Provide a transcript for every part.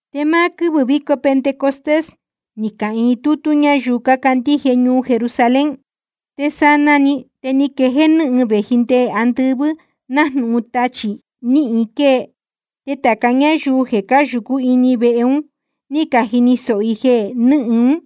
Te máá quɨ́vɨ̄ víco Pentecostés ni cahīin tútú ñáyuu cácandíje ñuu Jerusalén. Te sanaa‑ni te ni quejéé nɨ́hɨn vēji nde andɨvɨ́ nájnūhun tachī níhin quée, te tāca ñáyuu jeē cáyūcú ini vehe un ní cajini sōho i jeē nɨ́hɨn ún.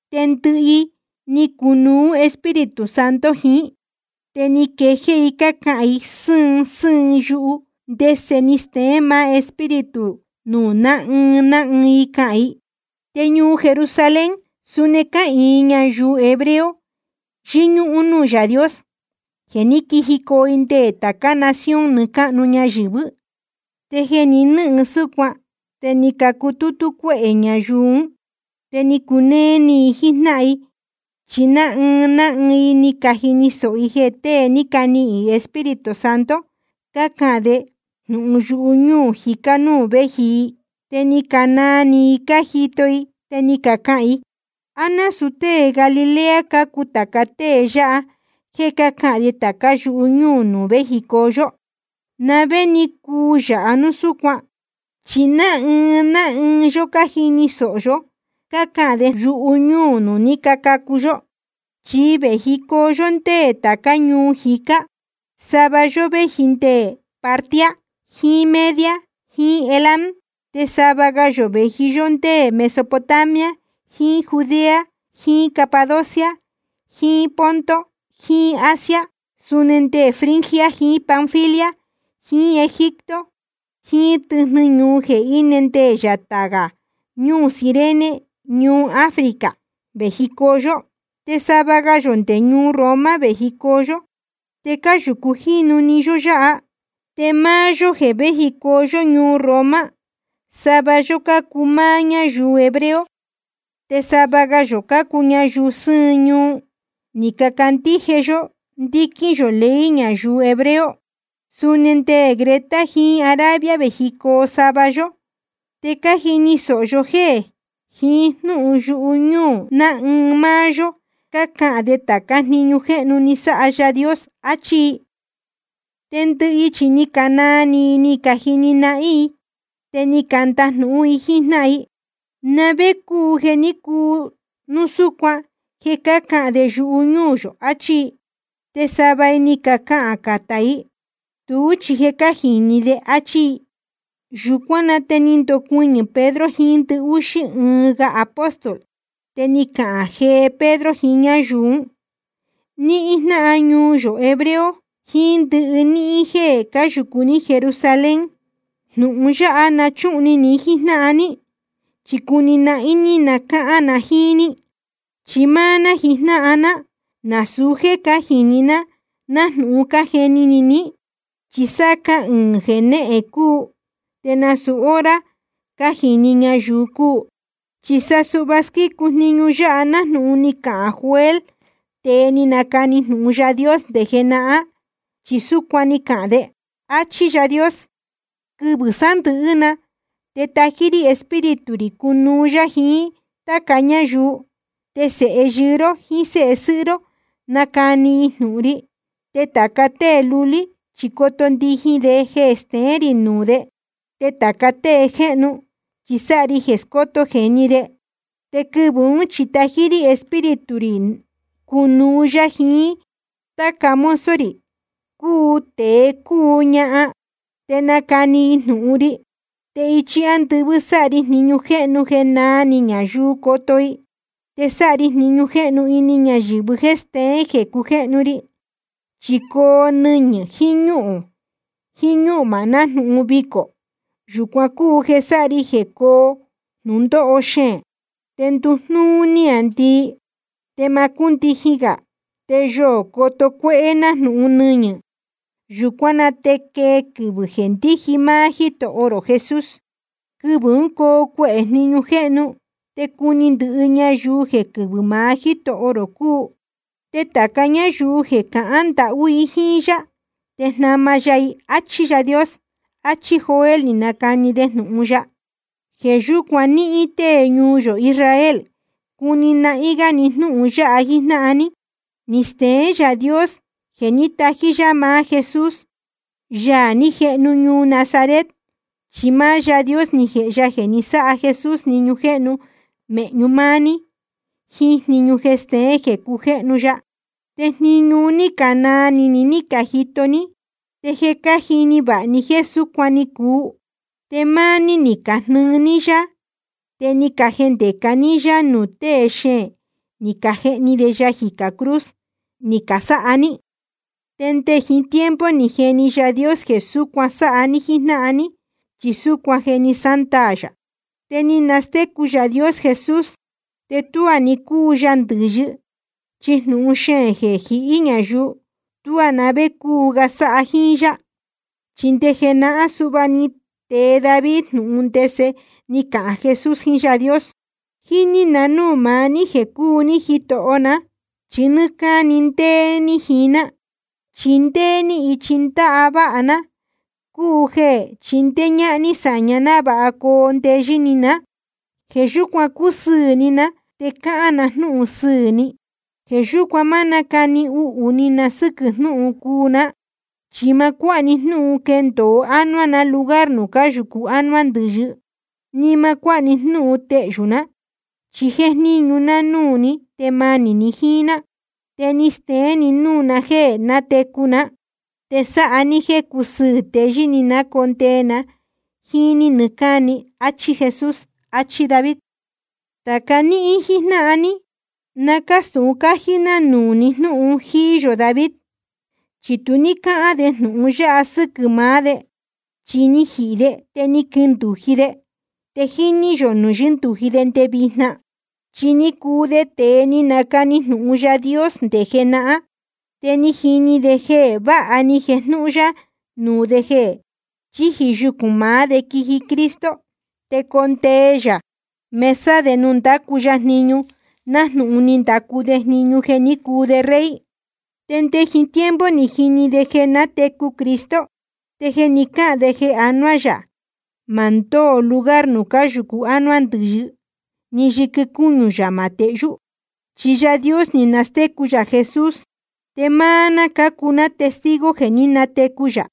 Te ndɨhɨ i, ni cunuú Espíritu Santo jiín i, te ni quejéé i cácahān i sɨ́ɨn sɨ́ɨn yuhu, ndese ni steén maá Espíritu nuū ná ɨɨn ná ɨɨn i cahān i. Te ñuu Jerusalén, suni cáhīin ñayuu hebreo, yɨñúhún núū Yaā Dios, jeē ní quijicoo i nde tācá nación nɨɨ́ cáhnu ñayɨ̄vɨ́. Te jeē ni nɨ́hɨn súcuan te ni cacutútú cuéhē ñayuu ún. Te ni cunéé íī ni i jíjnáhan i, chi ná ɨɨn ná ɨɨn i ni cajini sōho i jeē tée ni canihīn Espíritu Santo cácahān de jnūhun yuhu ñúū jicá nuū véji i. Te ni canaa ni i cájito i te ni cacahān i: ¿A násūu tée Galilea cácuu tāca tée yáha jéē cácahān de tācá yuhu ñúū nuū véjicoo yó? ¿Na vé ni cuu yāha núu súcuan? Chi ná ɨɨn ná ɨɨn yó cájini sōho yó cácahān de jnūhun yuhu ñúū nuū ní cacacu yó. Chi vējicoo yó ndé tācá ñuu jicá. Sava yó véji nde Partia jiín Media jiín Elam. Te sava ga yō vēji yó ndé Mesopotamia jiín Judea jiín Capadocia jiín Ponto jiín Asia. Suni nde Frigia jiín Panfilia jiín Egipto jiín tɨjnɨ ñuu jeē íne nde yatā gā ñuu Cirene ñuhun Africa vējicoo yó. Te sava ga yō nde ñuu Roma vējicoo yó, te cáyūcu jínu‑ni yó yáha. Te máá yó jeē véjicoo ñuu Roma, sava yó cácuu máá ñáyuu hebreo te sava ga yō cácuu ñayuu sɨ́ɨn ñuu, ni cacandíje yó ndíquín yō ley ñayuu hebreo. Suni nde Creta jiín Arabia vējicoo sava yó. Te cájini sōho yó jéē jiín jnúhun yuhu ñúū ná ɨɨn ná ɨɨn máá yó cácahān de tācá jniñu jéhnu ní sáha Yaā Dios, achí i. Te ndɨhɨ i chi ni canaa iī ni i cájini nahín i. Te ni candajnūhún i jíín jnáhan i: ¿Na vé cúu jeē ní cuu núu súcuan jeē cácahān de yuhu ñúū yō? achí i. Te sava i ni cacahān catá i: Tuú chi jeē cánajīni de, áchí i. Yūcuán na te ni candocuɨñɨ̄ Pedro jiín ndɨhúxí ɨɨn ga apóstol, te ni cahān jee Pedro jiín ñáyuu ún: Níhín jnáhan ñuu yō hebreo, jiín ndɨhɨ níhín jéē cáyūcu ní Jerusalén, jnūhun yáha na chúhun ni ni jíjnáhan ní, chi cuni nahín ní cahān na jíín ní. Chi máá ná jijnáhan ná, nasūu jéē cájīni ná nájnūhun cájeni ni ní, chi sáá cahɨɨ̄n jenéhen cúu, te nasūu hora cánajīni ñayuu cúu. Chi sa suhva squícu jniñu yáha nájnūhun ni cahān Joel, tēe ni nacani jnūhun Yaā Dios nde jenahán, chi súcuan ni cahān de: Achí Yáā Dios: Quɨvɨ̄ sándɨ̄hɨ́ na te tají rí Espíritu rī cunuú yá jiín táca ñáyuu, te sēhe yɨɨ́ ró jiín séhe sɨ́hɨ́ ró, nacani i jnūhun ri, te tāca tée lulí chi coto ndijin de jeē steén rī nuū de, te tāca tée jéhnu chi sáha ri jeē scóto jēni de. Te quɨvɨ̄ ún chi tají rí Espíritu rī cunuú yá jiín táca mozo rī, cúu tēe cúu ñahan, te nacani i jnūhun ri. Te ichi ándɨvɨ́ sáha ri jniñu jéhnu jeē náā ni ñayuu coto i, te sáha ri jniñu jéhnu ini ñayɨ̄vɨ jéē steén jeē cujéhnu ri, chi coo nɨñɨ̄ jiín ñúhūn jiín ñúhmā nájnūhun vicō. Yūcuan cúu jeē sáha ri jeē cóo jnūndóho xeēn. Te nduu jnúú níāndii te ma cúndijin gā, te yoō coto cuéhé nájnūhun nɨñɨ̄. Yūcuán na te quee quɨvɨ̄ jeē ndíji máá Jítoho rō Jesús. Quɨvɨ̄ ún coo cuehē jniñu jéhnu, te cuni ndɨhɨ ñayuu jeē quɨvɨ́ maá Jítoho rō cúu. Te tāca ñáyuu jeē cahān ndahú i jíín yá te jnama ya i, áchí Yáā Dios. Achí Joel ni nacani de jnūhun ya. ’Jeē yúcuan níhín tée ñuu yō Israel, cuni nahín gá ni jnúhun yáha jíjnáhan ní. Ni steén Yaā Dios jeē ní tají yá maá Jesús, Yaā ní jehnu ñuu Nazaret, chi máá Yáā Dios ni jēhe ya jeē ni sáha Jesús jniñu jéhnu mēhñu máá ní, jiín jniñu jeē steén jeē cujéhnu ya, te jniñu un ní canaa ni ni ní cajito ní. Te je cájini vāha ní jéē súcuan ni cuu. Te máá ní ni cajnɨɨ ní yá, te ni cajendēca ní yá nuū tée xeēn ni cajehni de ya jicā cruz ni casáha ní. Te nde jiín tiempo je ni jini Yaā Dios jeē súcuan sáha ní jíjnáhan ní, chi súcuan je ni sándaā yā. Te ni nastécu Yaā Dios Jesús te tuá ni cúu ya ndɨ̄yɨ, chi jnūhun xeēn jeē jihí ñayuu, tuá na vé cúu ga sáha jíín yá. Chi nde jenahán suhva ni tee David jnūhun ndese ni cahān Jesús jiín Yáā Dios: Jíní na núū maá ní jeē cúu ní Jítoho ná, chi nɨ́ɨ́ cáni ndéé ní jiín ná, chi ndéé ní ichi ndáváha ná, cúu jeē chindéé ñáhán ní sāña návāha coo ndeyɨ́ ni ná. Jeē yúcuan cúsɨɨ̄ ni ná te cáhán na jnúhun sɨɨ̄ ni. Jeē yúcuan ma nácani uhū ni na sɨ́quɨ̄ jnúhun cuu ná. Chi ma cuáha ni jnúhun quendōo ánuá na lugar nuū cáyūcu ánuá ndɨ̄yɨ, ni ma cuáha ni jnúhun tehyū ná, chi jéjníñu ná núū ní te manī ni jíín ná. Te ni steén ni núū na jéē nátecu ná, te sáha ní jéē cusɨɨ̄ teyɨ́ ni ná condee na jíín ní nɨɨ́ cáni. Achí Jesús, ni achi David. ’Tāca níhín jíjnáhan ní, na cástūhun cájí ná nuū ni jnúhun jíí yō David, chi tu ní cáhán de jnūhun yáha sɨ́quɨ̄ maá de. Chi ni jihī de te ni quindūji de, te jíní yō nuū yɨ́ndūji de nde vijna. Chi ni cuu de tēe ni nacani jnūhun Yaā Dios nde jenahán. Te ni jini de jeē váha ni jejnūhun ya nuū de jeē chíji yucūn maá de quiji Cristo, te condee yā mesa de ndacu ya jniñu nájnūhun ni ndacu de jniñu jeē ní cuu de rey. Te nde jiín tiempo ni jini de jeē nátecu Cristo, te ni cahān de jeē anuá yā, ma ndóo lugar nuū cáyūcu ánuá ndɨ̄yɨ, ni yɨquɨ cúñu yā ma tehyú. Chi Yaā Dios ni nastécu yā Jesús, te máá ná cácuu ná testigo jeē ní natecu yā.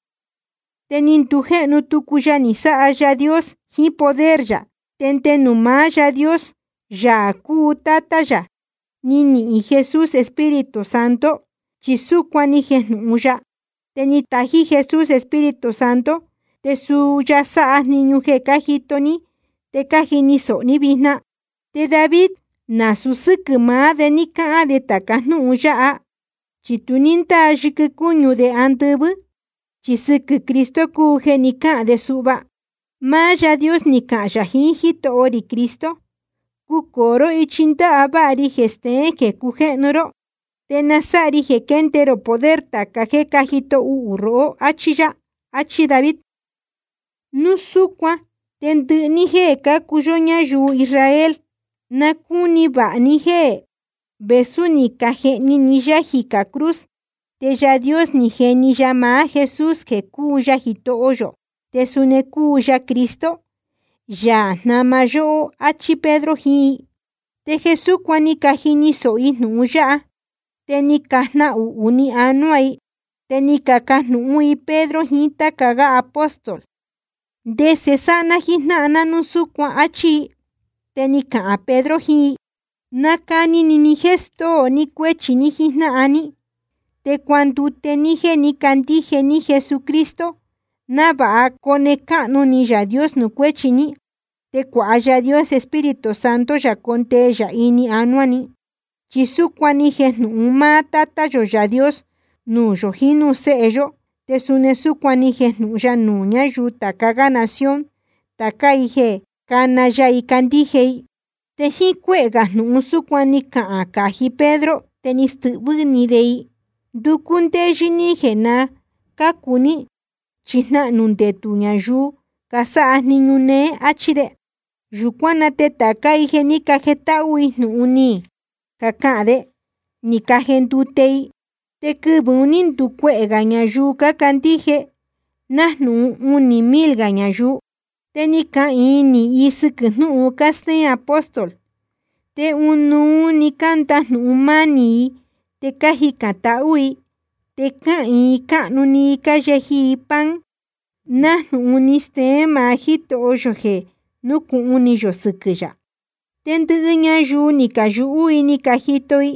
Te ni ndujéhnu tucu ya ni sáha Yaā Dios jiín poder yā. Te nde nuū maá Yáā Dios, Yaā cúu Tátá yā, ni nihīn Jesús Espíritu Santo, chi súcuan ni jejnūhun ya. Te ni tají Jesús Espíritu Santo, te suu ya sáha jniñu jeē cájito ní te cájini sōho ní vijna. Te David, nasūu sɨ́quɨ̄ maá de ní cáhán de tāca jnúhun yáha, chi tu ní ndáa yɨquɨ cúñu de andɨvɨ́. Chi sɨquɨ̄ Cristo cúu jeē ni cáhān de suhva: Máá Yáā Dios ni cahān yā jiín Jítoho rī Cristo: Cucōo ró ichi ndáváha ri jeē steén jeē cujéhnu ró. Te na sáha ri jeē quende rō poder tāca jéē cájito uhū rohó, áchí yá. Achí David. ’Núu súcuan te ndɨhɨ ní jéē cácuu yó ñayuu Israel, na cúni vāha ní jéē vēsú ni cajehni ni yá jicā cruz, te Yaā Dios ni jeni ya maá Jesús jeē cúu ya Jitoho yō te suni cúu ya Cristo, Yaā jnáma yóhó, áchí Pedro jiín i. Te jeē súcuan ni cajini sōho i jnūhun yáha, te ni cajnahuhū ni anuá i. Te ni cacajnūhún i Pedro jiín táca gá apóstol: ¿Te ndese sáha ná jíjnáhan ná núu súcuan? áchí i. Te ni cahān Pedro jiín i: Nacani ni ni jéē stóo ni cuéchi ní jíjnáhan ní, te cuandute ní jéē ní cacandíje ní Jesucristo, návāha cone cáhnu ni Yaā Dios nuū cuéchi ní, te cuāha Yaā Dios Espíritu Santo yā condee yā ini anuá ni. Chi súcuan ni jejnūhun máá Tátá yō Yaā Dios nuū yō jiín núū séhe yó, te suni súcuan ni jejnūhun ya nuū ñáyuu tāca gá nación, tācá i jeē cána ya i candíje i. Te jíín cuéhē gā jnūhun súcuan ni cahān cají Pedro, te ni stɨhvɨ́ ni de i: Nducú ndéyɨ́ ní jeē na cácu ní, chi jnahnū ndetū ñayuu casáha jniñu néé, áchí de. Yūcuán na te tācá i jeē ní cajetáhú jnúhun ni cahān de, ni cajendute i. Te quɨvɨ̄ un ní nducuehē gā ñayuu cácandíje, nájnūhun unī mil gā ñayuu. Te ni cahīin nīhin i sɨquɨ̄ jnúhun cástéén apóstol. Te ɨnuú‑ni cándajnūhun mánī i te cájicān tahú i, te ɨɨn cáhnu‑ni cáyeji i pan, nájnūhun ni steén maá Jítoho yō jeē núcūhun ni yō sɨquɨ̄ yā. Te ndɨhɨ ñayuu ni cayūhú i ni cajito i,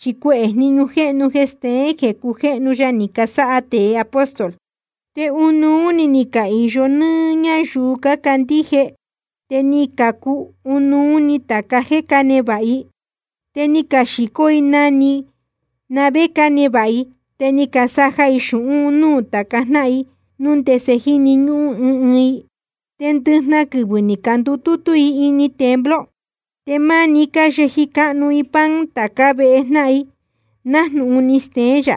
chi cuehē jniñu jéhnu jeē steén jeē cujéhnu ya ni casáha tēe apóstol. Te ɨnuú ní cahīyo ni ñayuu cácandíje, te ni cacuu ɨnuú i tāca jéē cánevāha i. Te ni caxīcó i na‑ni na vé cánevāha i, te ni casaja i xūhún un núū tāca jnáhan i, núu ndese jíni ñúhún ɨɨn ɨɨn i. Te ndɨjnahan quɨvɨ̄ ni candutútú i ini templo. Te manī ni cayeji cáhnu i pan tācá vehe jnáhan i nájnūhun ni steén yā,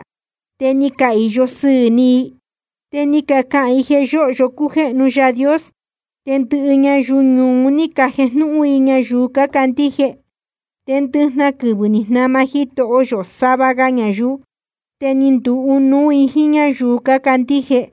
te ni cahīyo sɨɨ̄ ni i. Te ni cacahān i jeē yóhyo cújéhnu Yaā Dios. Te ndɨhɨ ñayuu ñuu un ní cajejnúhún i ñayuu cácandíje. Te ndɨjnahan quɨvɨ̄ ni jnama Jitoho yō sava ga ñayuu, te ni nduu ɨnuú i jíín ñáyuu cácandíje.